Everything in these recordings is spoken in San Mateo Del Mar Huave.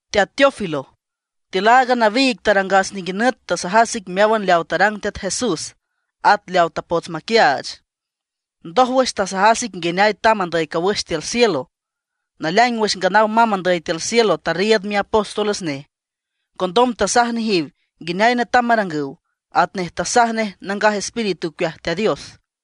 Teat Teófilo, tiül aaga nawiig tarangas ninguinüt tasajas ic meáwan leaw tarang Teat Jesús, at leaw tapots maquiaach. Ndójwüx tasajas ic nguineay tamb andüy cawüx tiül cielo. Naleaing wüx nganaw mamb andüy tiül cielo tarriiüd miapóstoles nej. Condom tasaj nejiw nguineay netam marangüw, atnej tasaj nej Nangaj Espíritu ocueaj Teat Dios.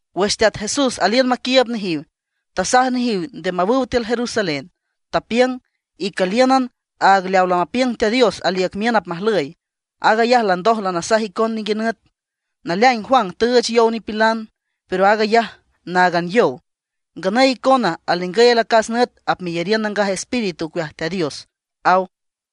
Wüx Teat Jesús aliün maquiiüb nejiw, tasaj nejiw nde mawüw tiül Jerusalén, tapiüng: ―Icüliün aag leaw lamapiüng Teat Dios aliüc miün apmajlüy. Aag ayaj landoj lanasaj icon ninguinüt. Naleaing Juan tüüch yow nipilan, pero aag ayaj náagan yow. Nganüy icona alningüy alacas nüt apmeyariün Nangaj Espíritu ocueaj Teat Dios ―aw.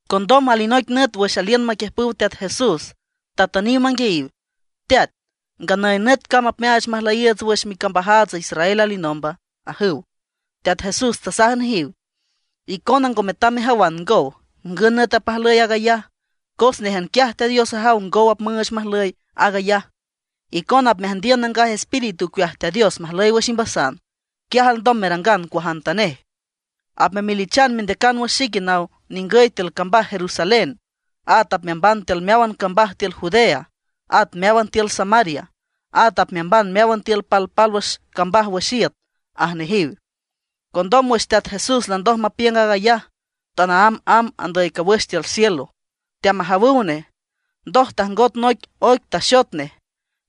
Condom alinoic nüt wüx aliün maquiüjpüw Teat Jesús, tatüniw manguiayiw: ―Teat, ¿nganüy nüt cam apmeaach majlüyiiüts wüx micambajaats Israel alinomba? ―ajüw. Teat Jesús tasaj nejiw: ―Icona ngo metam mejawan ngow, ngün nüt apmajlüy aag ayaj. Cos néjan quiaj Teat Dios ajaw ngow apmüüch majlüy aag ayaj. Icona apmeajndiün Nangaj Espíritu ocueaj Teat Dios majlüy wüx imbasan, quiaj alndom merangan cuajantanej. Apmemelichan mendeacan wüx xique naw ningüy tiül cambaj Jerusalén. At apmeamban tiül meáwan cambaj tiül Judea, at meáwan tiül Samaria. At apmeamban meáwan tiül palpálwüx cambaj wüx iüt ―aj nejiw. Condom wüx Teat Jesús landoj mapiüng aag ayaj, tanaámb amb andüy cawüx tiül cielo, teamajawüw nej. Ndoj tajngot noic oic taxot nej,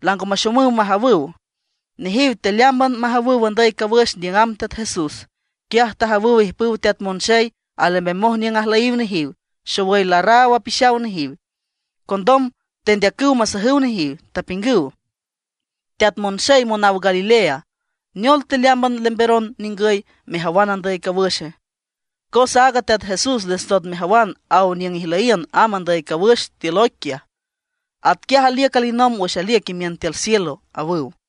lango maxomüw majawüw. Nejiw tealeámban majawüw andüy cawüx niüng amb Teat Jesús, quiaj tajawüw ijpüw teat monxey alembemoj niüng ajlüyiw nejiw, xowüy larraw apixaw nejiw. Condom tendeacüw masajüw nejiw, tapiüngüw: ―Teat monxey monaw Galilea ¿neol teleámban lembemeron ningüy mejawan andüy cawüxe? Cos aaga Teat Jesús les ndot mejawan aw niüng ijlüyiün amb andüy cawüx tiül oic quiaj, atquiaj aliüc alinomb wüx aliüc imiün tiül cielo ―awüw.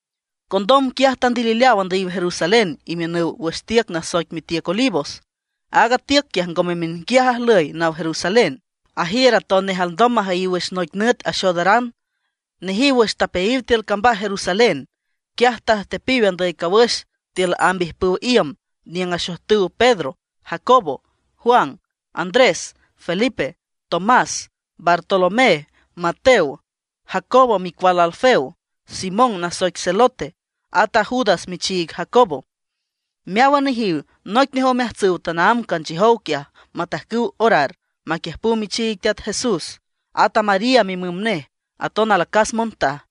Condom quiaj tandilileaw andüyiw Jerusalén imiünüw wüx tiüc nasoic mitiüc Olivos. Aaga tiüc quiaj ngome miünquiaj ajlüy naw Jerusalén; ajiür atonej alndom majüyiw wüx noic nüt axoodaran. Nejiw wüx tapeayiw tiül cambaj Jerusalén, quiaj tajtepiw andüyiw cawüx tiül amb ijpüw iüm niüng axojtüw Pedro, Jacobo, Juan, Andrés, Felipe, Tomás, Bartolomé, Mateo, Jacobo micual Alfeo, Simón nasoic Zelote, at a Judas michiig Jacobo. Meáwan nejiw noic nej omeajtsüw tanaámb canchiüjow quiaj matajcüw orar, aquiüjpüw michiig Teat Jesús, at a María mimüm nej, aton alacas montaj.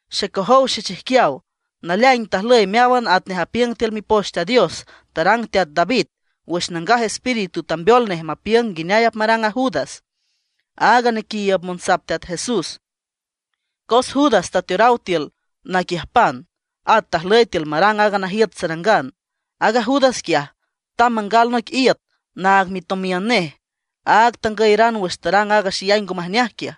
―Xecojow xechijquiaw, naleaing tajlüy meáwan atnej apiüng tiül Mipoch Teat Dios tarang teat David, wüx Nangaj Espíritu tambeol nej mapiüng nguineay apmarang a Judas, aaga nequiiüb monsap Teat Jesús. Cos Judas tateoraw tiül naquiüjpan, at tajlüy tiül marang aaga najiüt sarangan. Aaga Judas quiaj, tamb mangal noic iüt naag mitomiün nej, aag tangüyeran wüx tarang aaga xeyay ngo majneaj quiaj.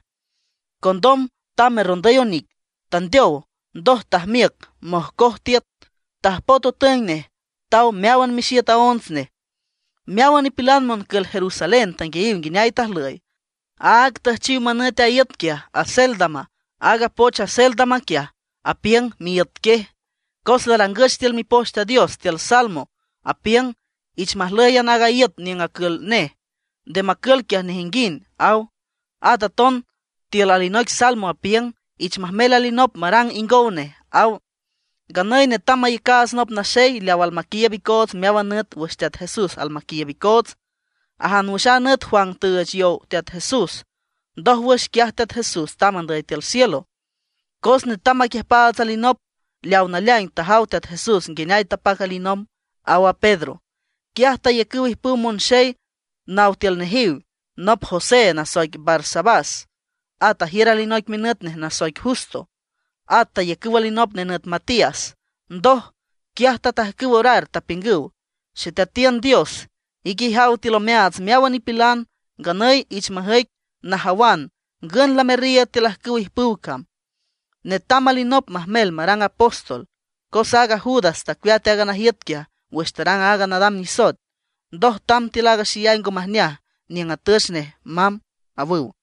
Condom tamb terrondüy onic, tandeow. Ndoj tajmiüc mojcoj tiüt, tajpoet otüeng nej, taw meáwan mixiüt aonts nej. Meáwan nipilan moncül Jerusalén tanguiayiw nguineay tajlüy. Áag tüjchiw manüt aaga iüt quiaj Acéldama. Aaga poch Acéldama quiaj, apiüng Miíüt Quiej. ’Cos larangüch tiül Mipoch Teat Dios tiül Salmo, apiüng: Ich majlǘyan aaga iüt niüng acül nej, nde macül quiaj nejinguind, aw. At aton tiül alinoic Salmo apiüng: Ich majmel alinop marang ingow nej, aw. ’Nganüy netam mayacaats nop naxey leaw almaquiiüb icoots meáwan nüt wüx Teat Jesús almaquiiüb icoots, ajan wüx a nüt Juan tüüch yow Teat Jesús, ndójwüx quiaj Teat Jesús tamb andüy tiül cielo. Cos netam maquiüjpaats alinop leaw naleaing tajaw Teat Jesús nguineay tapac alinomb ―aw a Pedro. Quiaj tayacüw ijpüw monxey náwan tiül nejiw, nop José nasoic Barsabás, at ajiür alinoic minüt nej nasoic Justo. At tayacüw alinop nenüt Matías. Ndoj, quiaj tatajcüw orar, tapiüngüw: ―Xeteatiün Dios, ique ijaw tiül omeaats meáwan nipilan, nganüy iich majüic najawan ngün lamerriiüd tiül ajcüwa ijpüw cam. Netam alinop majmel marang apóstol, cos aaga Judas tacueat aaga najiüt quiaj wüx tarang aaga nadam nisoet, ndoj tamb tiül aaga xeyay ngo majneaj niüng atüch nej mamb ―awüw.